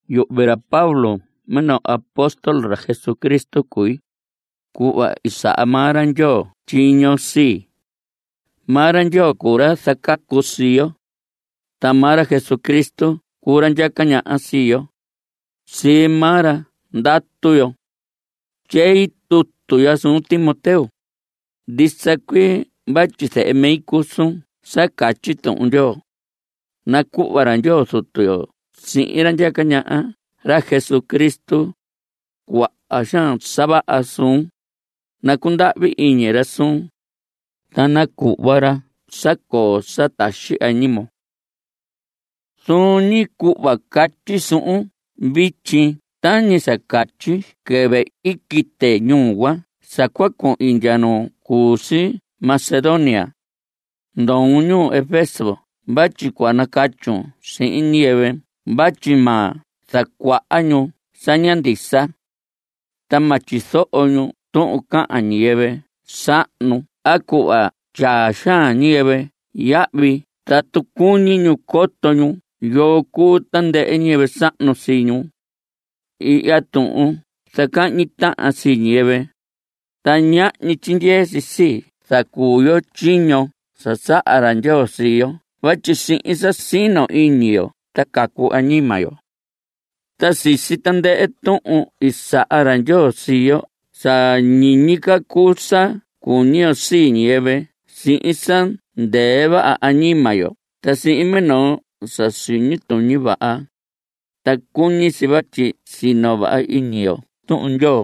Yuhvi ra Pablo minoo apóstol ra Jesucristo cui, cuhva i saha maa ra Ndyoo tyiño sii. Maa ra Ndyoo cuu ra zacacu sii yo. Ta maa ra Jesucristo cuu ra ndyaca ñaha sii yo. Sii maa ra ndatu yo. Tyei tutu ya suun Timoteo. Ndisa cuii vatyi zehe mi cuu suun sa catyi Tuhun Ndyoo. Nacuhva ra Ndyoo Zutu yo sihin ra ndyaca ñaha, ra Jesucristo, cuaha xaan sa vaha suun; nacundahvi iñi ra suun, ta nacuhva ra sa coo sa taxi añimon. Zuun ñi cuhva catyi suhun vityi tañi sa catyi quɨvɨ i quite ñuu cuan sa cua cuhin ndya nu cu si Macedonia, ndoon ñuu Efeso vatyi cua nacatyun sihin ñiyɨvɨ vatyi ma zacuaha ñu sa ña ndisa. Ta ma tyizoho ñu tuhun cahan ñiyɨvɨ sahnu a cuhva tyaa xaan ñiyɨvɨ yahvi tatu cuñi ñu coto ñu yoo cuu tandɨhɨ ñiyɨvɨ sahnu sii ñu. Ihya tuhun zacahñi tahan si sii ñiyɨvɨ, ta ñahñi tyindyee si sa zacuu yo tyiño sa saha ra Ndyoo sii yo vatyi sihin sa sino ñi iñi yo ta cacu añima yo. Ta sisi tandɨhɨ tuhun i saha ra Ndyoo sii yo sa ñiñi ca cuu sa cuñi yo sii ñiyɨvɨ sihin sa ndɨɨ vaha añima yo ta sihin minoo sa siñi tuñi vaha. Ta cuñi si vatyi sino vaha iñi yo Tuhun Ndyoo,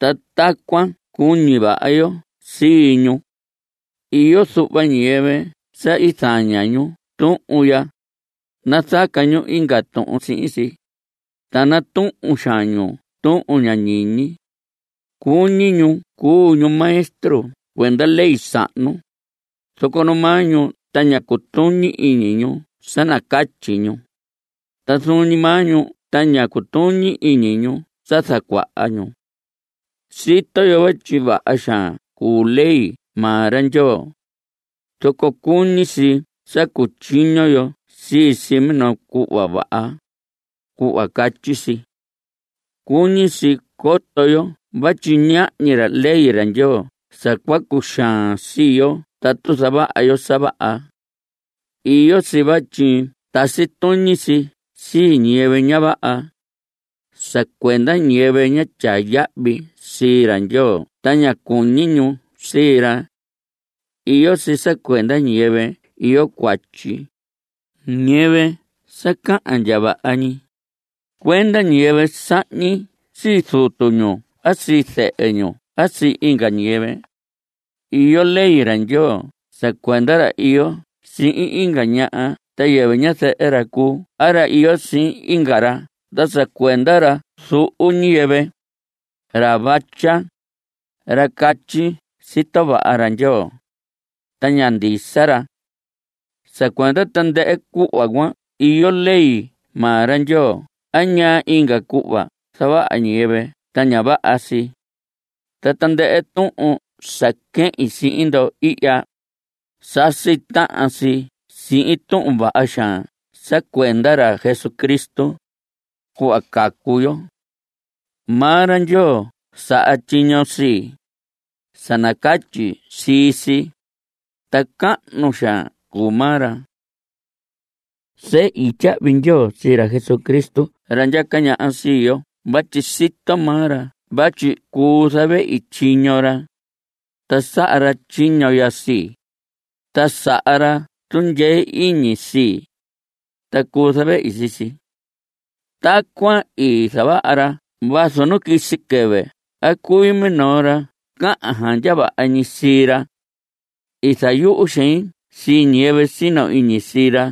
ta tacuan ta cua cuñi vaha yo sii ñu. Iyo zuhva ñiyɨvɨ sa i zaña ñu tuhun ya. Nazaca ñu inga tuhun sihin si, ta natuhun xaan ñu tuhun ña ñiñi. Cuñi ñu cuu ñu maestro cuenda ley sahnu, zoco nu maa ñu ta ña cutuñi iñi ñu sa nacatyi ñu. Ta zuun ñi maa ñu ta ña cutuñi iñi ñu sa zacuaha ñu. Sito yo vatyi vaha xaan cuu ley maa ra Ndyoo, zoco cuñi si sa cutyiño yo sii si minoo cuhva vaha, cuhva catyi si. Cuñi si coto yo vatyi ñahñi ley Ndyoo sa cua cuxaan sii yo tatu zavaha yo sa vaha. Iyo si vatyi tasi tuñi si sii ñiyɨvɨ ña vaha, sa cuenda ñiyɨvɨ ña tyaa yahvi sii ra Ndyoo ta ña cuñi ñu sii ra. Iyo si sa cuenda ñiyɨvɨ iyo cuatyi, ñiyɨvɨ sa cahan ndya vaha ñi, cuenda ñiyɨvɨ sahñi sii zutu ñu a sii zɨhɨ ñu a sii inga ñiyɨvɨ. Iyo ley ra Ndyoo sa cuenda ra iyo sihin inga ñaha sa yɨvɨ ñazɨhɨ ra cuu a ra iyo sihin inga ra ta sa cuenda ra zuhu ñiyɨvɨ, ra vatya, ra catyi “sito vaha Ndyoo” ta ña ndisa ra. Sa cuenda tandɨhɨ cuhva cuan iyo ley maa ra Ndyoo a ñaa inga cuhva zavaha ñiyɨvɨ ta ña vaha si. Ta tandɨhɨ tuhun sa quehin sihin ndo ihya, sasi tahan si sihin tuhun vaha xaan sa cuenda ra Cristo, cuhva cacu yo. Maa ra Ndyoo saha tyiño sii, sa nacatyi sii si, ta cahnu xaan cuu maa ra. Sehi tyahvi ndyoo sii ra Jesucristo ra ndyaca ñaha sii yo vatyi sito maa ra vatyi cuu zavehi tyiño ra, ta saha ra tyiño ya sii, ta saha ra tundyee iñi sii, ta cuu zavehi sii si. Tacuan i zavaha ra vazu nu quisi quɨvɨ i cui minoo ra cahan xaan ndya vaha ñi sii ra. I zayuhu xein sii ñiyɨvɨ sino iñi sii ra,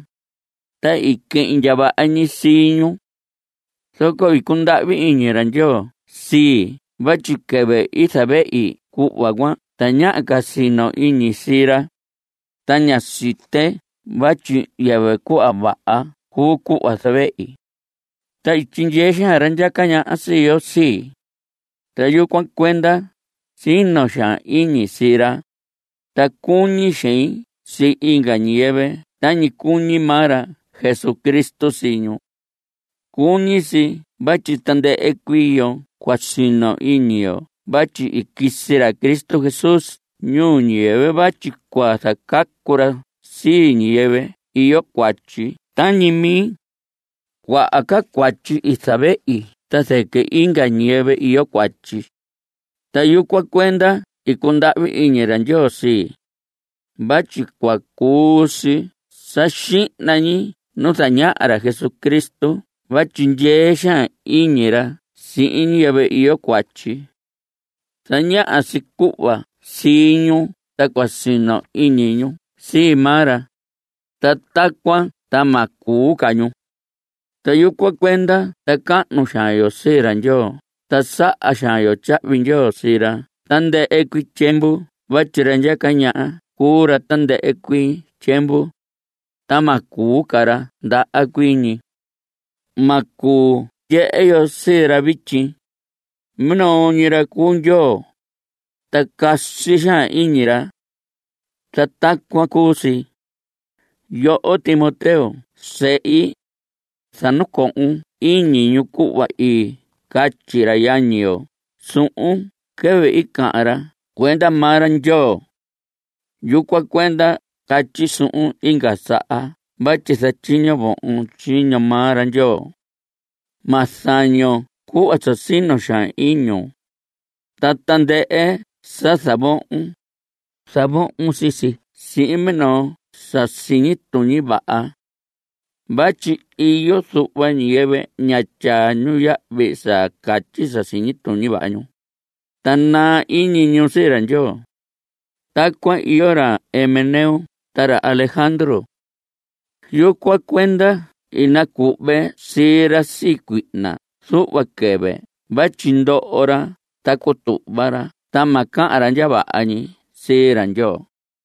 ta i quehin ndya vaha ñi sii ñu. Zoco i cundahvi iñi ra Ndyoo sii vatyi quɨvɨ i zavehi cuhva cuan tañaha ca sino iñi sii ra, ta ñá site vatyi yɨvɨ cuhva vaha cuu cuhva zavehi. Ta i tyindyee xaan ra ndyaca ñaha sii yo sii, ta yucuan cuenda sino xaan iñi sii ra, ta cuñi xein sii inga ñiyɨvɨ tañi cuñi maa ra Jesucristo sii ñu. Cuñi si vatyi tandɨhɨ cuii yo cua sino iñi yo vatyi i quisi ra Cristo Jesús ñuu ñiyɨvɨ vatyi cua zacacu ra sii ñiyɨvɨ iyo cuatyi tañi mi. Cuaha ca cuatyi i zavehi ta zɨquɨ inga ñiyɨvɨ iyo cuatyi. Ta yucuan cuenda i cundahvi iñi ra Ndyoo sii, vatyi cua cuu si sa xihna ñi nu zañaha ra Jesucristo vatyi ndyee xaan iñi ra sihin ñiyɨvɨ iyo cuatyi. Zañaha si cuhva sii ñu ta cua sino iñi ñu sii maa ra, ta tacuan ta ma cuu ca ñu. Ta yucuan cuenda zacahnu xaan yo sii ra Ndyoo ta saha xaan yo tyahvi ndyoo sii ra tandɨhɨ cuii tyiemvu vatyi ra ndyaca ñaha cuu ra tandɨhɨ cuii tyiemvu, ta ma cuu ra ndaha cuii ñi. Ma cuu ndyehe yo sii ra vityi. Minoo ñi ra cuu Ndyoo, ta casi xaan iñi ra. Ta tacuan cuu si. Yoho Timoteo zehi, sa nacohon iñun cuhva i catyi ra yañi yo suhun quɨvɨ i cahan ra cuenda maa ra Ndyoo. Yucuan cuenda catyi suhun inga saha vatyi zatyiño vohon tyiño maa ra Ndyoo. Ma zañon cuhva sa sino xaan iñun. Ta tandɨhɨ sa zavohon, zavohon sii si sihin minoo sa siñi tuñi vaha. Vatyi iyo zuhva ñiyɨvɨ ña tyaa ñu yahvi sa catyi sa siñi tuñi vaha ñu, ta naa iñi ñu sii Ndyoo. Tacuan iyo ra Himeneo ta ra Alejandro. Yucuan cuenda i nacuhve sii ra sii cuihna zuhva quɨvɨ vatyi ndoho ra ta cutuhva ra ta ma cahan ra ndya vaha ñi sii ra Ndyoo.